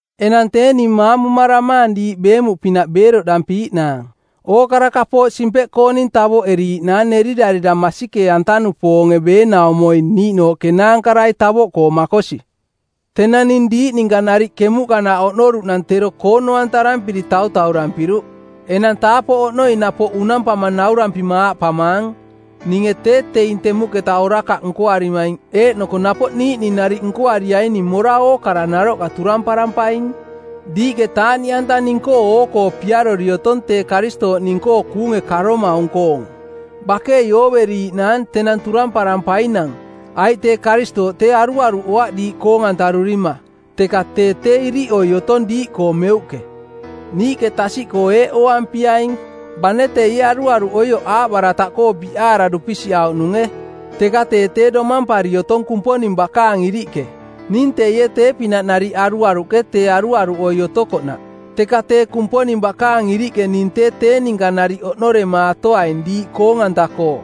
Enang tee ning maamumaramaang diiꞌ beemuꞌpinaꞌ beeroꞌdampiiꞌnaang. Ookara kapooꞌ simpeꞌkooning tavoꞌeriiꞌnaang nerirarira masikee-anta-nupoonge beenaumoi niiꞌnooꞌ kenaankarai tavoꞌkoo makosi. Tenang ning diiꞌ ninka nariꞌ kemuꞌkanaꞌ oꞌnoruꞌnang tero koono-antarampiri tautaurampiruꞌ. Enang taapoꞌ oꞌnoi napoꞌ unampama naurampima aaꞌpamaang: Ninge tee teing temuꞌketa orakaꞌ nkoarimaing eeꞌnoko napoꞌ niiꞌning nariꞌ nkoariaining mora ookara naroꞌka turamparampaing. Diiꞌke taaꞌniꞌanta ning-koo oo-koo piarori otong tee Karistooꞌ ning-koo kuunge karomaung-koong. Bakei ooveriiꞌnaang tenang turamparampainang, aiꞌ tee Karistooꞌ tee aruaruꞌoaꞌ diiꞌ koong-antarurima, teka tee tee iriꞌoi otong diiꞌkoo meuꞌke. Niiꞌke tasiꞌkoo eeꞌ ooampiaing, bane teie aruaruꞌoioꞌ aaꞌbarataꞌkoo biꞌaara dupisiꞌauꞌnunge, teka tee tee domampari otong Kumponing bakaang iriꞌke. Ning teie tee-pinaꞌ nariꞌ aruaruꞌke tee aruaruꞌoi otokoꞌnaꞌ, teka tee Kumponing bakaang iriꞌke ning tee tee ninka nariꞌ oꞌnoremaatoaing diiꞌ koong-anta-koo.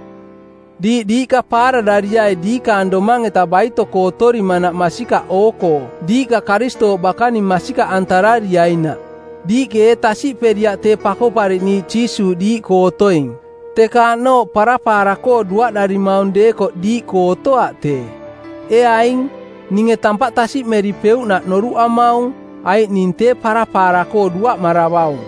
Diiꞌ diiꞌka paararariai diikaang domang-eta baito-koo otorimanaꞌ masikaꞌ oo-koo diiꞌka Karistooꞌ bakaning masikaꞌantarariainaꞌ. Diiꞌke ee tasiꞌperiaꞌ tee Pakoꞌpariꞌniiꞌ Jiisuuꞌ diiꞌkoo otoing? Teka aꞌnooꞌ parapaara-koo duaꞌdarimaung deekoꞌ diiꞌkoo otoaꞌ tee. Ee aing, ninge tampaꞌ tasiꞌmeripeuꞌnaꞌ noruꞌamaung, aiꞌ ning tee parapaara-koo duaꞌmaravaung.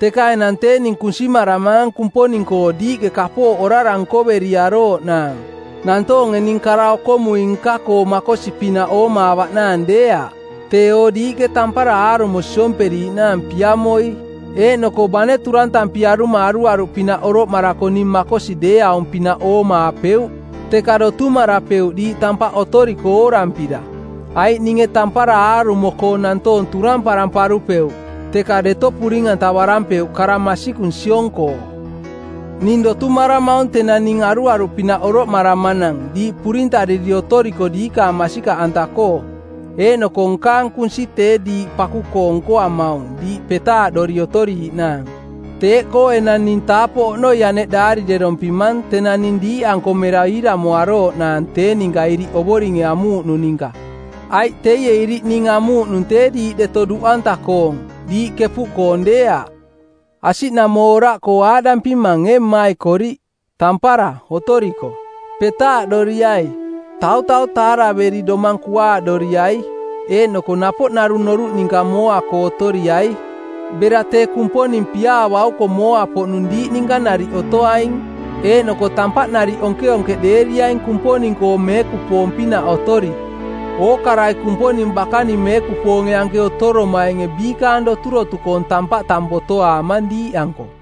Teka enang tee ning kunsimaramaang Kumponing-koo diiꞌke kapooꞌ orara nkoveriarooꞌnaang, nantoonge ning kara-okomui-nka-koo makosi-pinaꞌ oomaavaꞌnaang deeaꞌ, teeo diiꞌke tampara aarumo siomperiiꞌnaang piamoi. Eeꞌnoko bane turantampiaruma aruaruꞌpinaꞌ oroꞌmarako ning makosi deeaung-pinaꞌ oomaapeuꞌ, teka dotumarapeuꞌ diiꞌ tampaꞌ otoriko oorampira. Aiꞌ ninge tampara aarumo-koo nantoong turamparamparupeuꞌ, teka deto puring-antavarampeuꞌ kara masikung siong-koo. Ning dotumaramaung tenang ning aruaruꞌpinaꞌ oroꞌmaramanang diiꞌ purintariri otoriko diikaang masikaꞌanta-koo, eeꞌnoko nkaang kunsi tee diiꞌ paku-koo nkoamaung diiꞌ petaaꞌdori otoriiꞌnaang. Teeꞌkoo enang ning taapoꞌ oꞌnoi aneꞌ daarirerompimang tenang ning diiꞌanko mera iiramoarooꞌnaang tee ninka iriꞌ Ovoringe amuuꞌnung ninka. Aiꞌ teie iriꞌ ning amuuꞌnung tee diiꞌ deto duꞌanta-koong, diiꞌ kepuꞌkoong deeaꞌ. Asiꞌnamooraꞌkoo aaꞌdampimang ee mmaikoriꞌ: Tampara, otoriko! Petaaꞌdoriai. Tautau taaraveri domang kuaaꞌdoriai, eeꞌnoko napoꞌ narung noruꞌ ninka mooa-koo otoriai. Bera tee Kumponing piaa bauko mooa-poꞌnung diiꞌ ninka nariꞌ otoaing. Eeꞌnoko tampaꞌ nariꞌ onkeonkeꞌdeeriaing Kumponing-koo meekupoong-pinaꞌ otori. Ookarai Kumponing bakaning meekupoonge anke otoromainge biikaang doturotukoong tampaꞌ tang botoaamang diiꞌanko.